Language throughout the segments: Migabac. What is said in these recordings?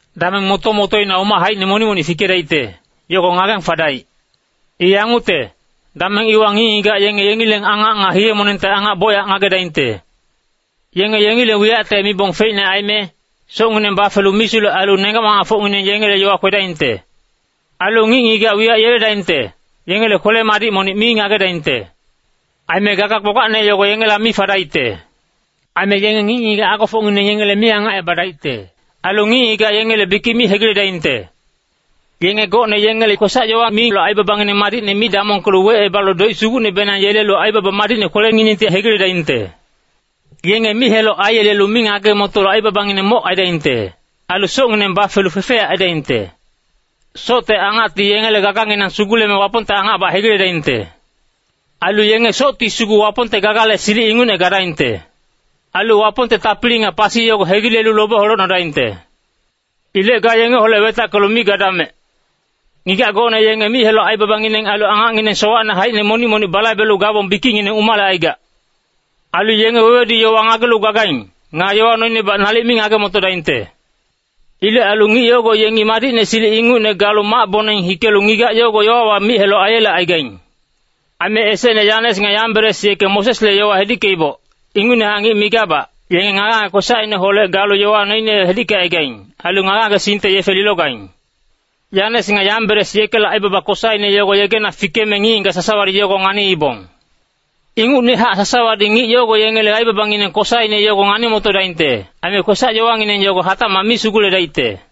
Dameng moto-motoina umac haicine monic-monic fikedaicte, yogo ngageng fadaic. I yangucte, dameng iwa ngic-ngigac yenge yengileng angac nga hiye-monengte angac bocyac ngagedaingte. Yenge yengileng wiyacte mibong feicne aime, socngineng bafelu misulec ailu nenggac-mamacfocngineng yengele yowa kwedaingte. Ailu ngic-ngigac wiyac yeledaingte, yengele kwele-madic monic mi ngagedaingte. Aime gaga gbagbacne yogo yengela mi fadaicte. Aime yenge ngic-ngigac agofocngineng yengele mi angacebadaicte. Ailu ngic-ngigac yengele bikic mi hegiledaingte. Yenge gocne yengele kwesac-yowa milu aibabangineng mi damongkelu wecebalu doic sugucnebenang yelelu aibaba madicne kwelenginengti hegiledaingte. Yenge mic-heloc aiyelelu mi ngage-motolu aibabangineng moc aidaingte. Ailu socngineng bafelu fefeyac aidaingte. Socte angacti yengele gaganginang suguleme Wapongte angacbac hegiledaingte. Ailu yenge socti sugu Wapongte gagale silic ingucne gadaingte. Ailu Wapongte tapili nga pasi yogo hegilelu lobe holecnodaingte. Ilec ga yengeholec wetackelu mi gadamec. Ngigac gocne yenge mic-heloc aibabangineng ailu angacngineng sowacne haicine monic-monic balaibelu gabong bikicngineng umalecaigac. Ailu yenge wewedu-yowa ngagelu gagaing. Nga yowa noinebac nalic mi ngage-motodaingte. Ilec ailu ngic yogo yenge madicne silic ingucne galu mac-boneng hikelu ngigac yogo yowawa mic-heloc aiyelecaigaing. Aime esecne Yanes nga Yamberes yeke Mosesle yowa hedickeiboc, ingucnehac ngic migabac, yenge ngage-ngage kwesacineholec galu yowa noine hedickecaigaing. Ailu ngage-ngagesingte yefe lilogaing. Yanes nga Yamberes yekele aibaba kosaine yogo yegena fikeme ngic-ngigac sasawadi yogo nganiibong. Ingucnehac sasawadi ngic yogo yengele aibabangineng kosaine yogo ngani-motodaingte. Aime kwesac-yowangineng yogo hatacmac mi suguledaicte.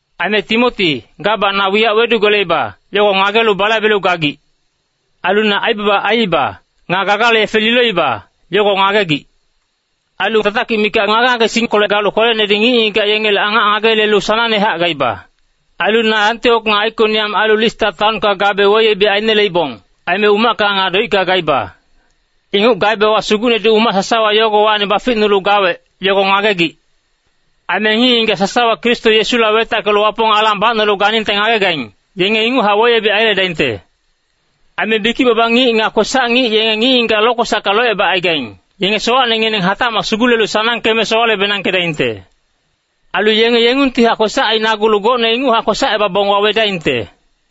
Aime Timoti, gabac na wiyac wedugeleiba, yogo ngagelu balaibelu gagic. Ailu na aibaba aiiba, nga gaganele yefe loiba, yogo ngagegic. Ailu tatakic mikac ngage-ngagesingkolec galu kwelenedi ngic-ngigac yengele angac ngageyelelu sanangnehac gaiba. Ailu na Antiok nga Aikoniam ailu Lista taonka gabe weyebic aineleibong, aime umacka nga doicka gaiba. Inguc gaebewa Sugucnedi umac sasawa yogowacni baficnulu gawec, yogo ngagegic. Aime ngic-ngigac sasawa Kristo Yesuholec wetackelu Wapong alang bacnolu ganingte ngagegaing, yenge inguchac weyebic aiyeledaingte. Aime bikic-baba ngic nga kwesac-ngic yenge ngic-ngigac lokwesacka locebacaigaing, yenge sowacnengineng hatacmac sugulelu sanangkeme sowale-benangkedaingte. Ailu yenge yengungtihac kwesac ainagulu gocne inguchac kwesacebabong wawedaingte.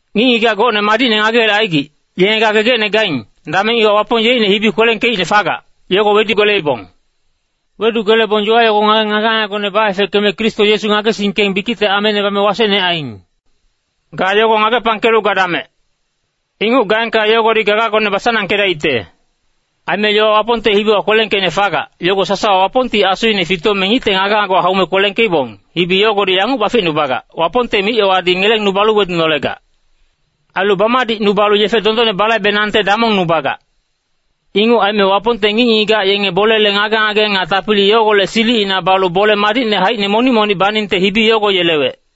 Ngic-ngigac gocne madicne ngageyelecaigic, yenge ga gegecne gaing, dameng iwa Wapong yeicne hibi kwelengkeicne fagac, yogo wedugeleibong. Wedugelebong yowa yogo ngageng ngage-ngagegone baefeckeme Kristo Yesu ngagesingkeng bikicte ameine bame wasecne aiing. Ga yogo ngagepangkelu gadamec. Inguc gaengka yogodi gagagone basanangkedaicte. Aime yowa Wapongte hibiwa kwelengkeicne fagac, yogo sasawa Wapongti asuine fitome ngicte ngage-ngagewa haume kwelengkeibong. Hibi yogodi yanguc baficnubagac, Wapongte mic-yowadi ngelengnubalu wedunolegac. Ailu bamadicnubalu yefe dondonne balaibenangte damongnubagac. Inguc aime Wapongte ngic-ngigac yenge bolele ngage-ngage nga tapili yogolec silicina balu bole madicne haicine monic-monic baningte hibi yogo yelewec.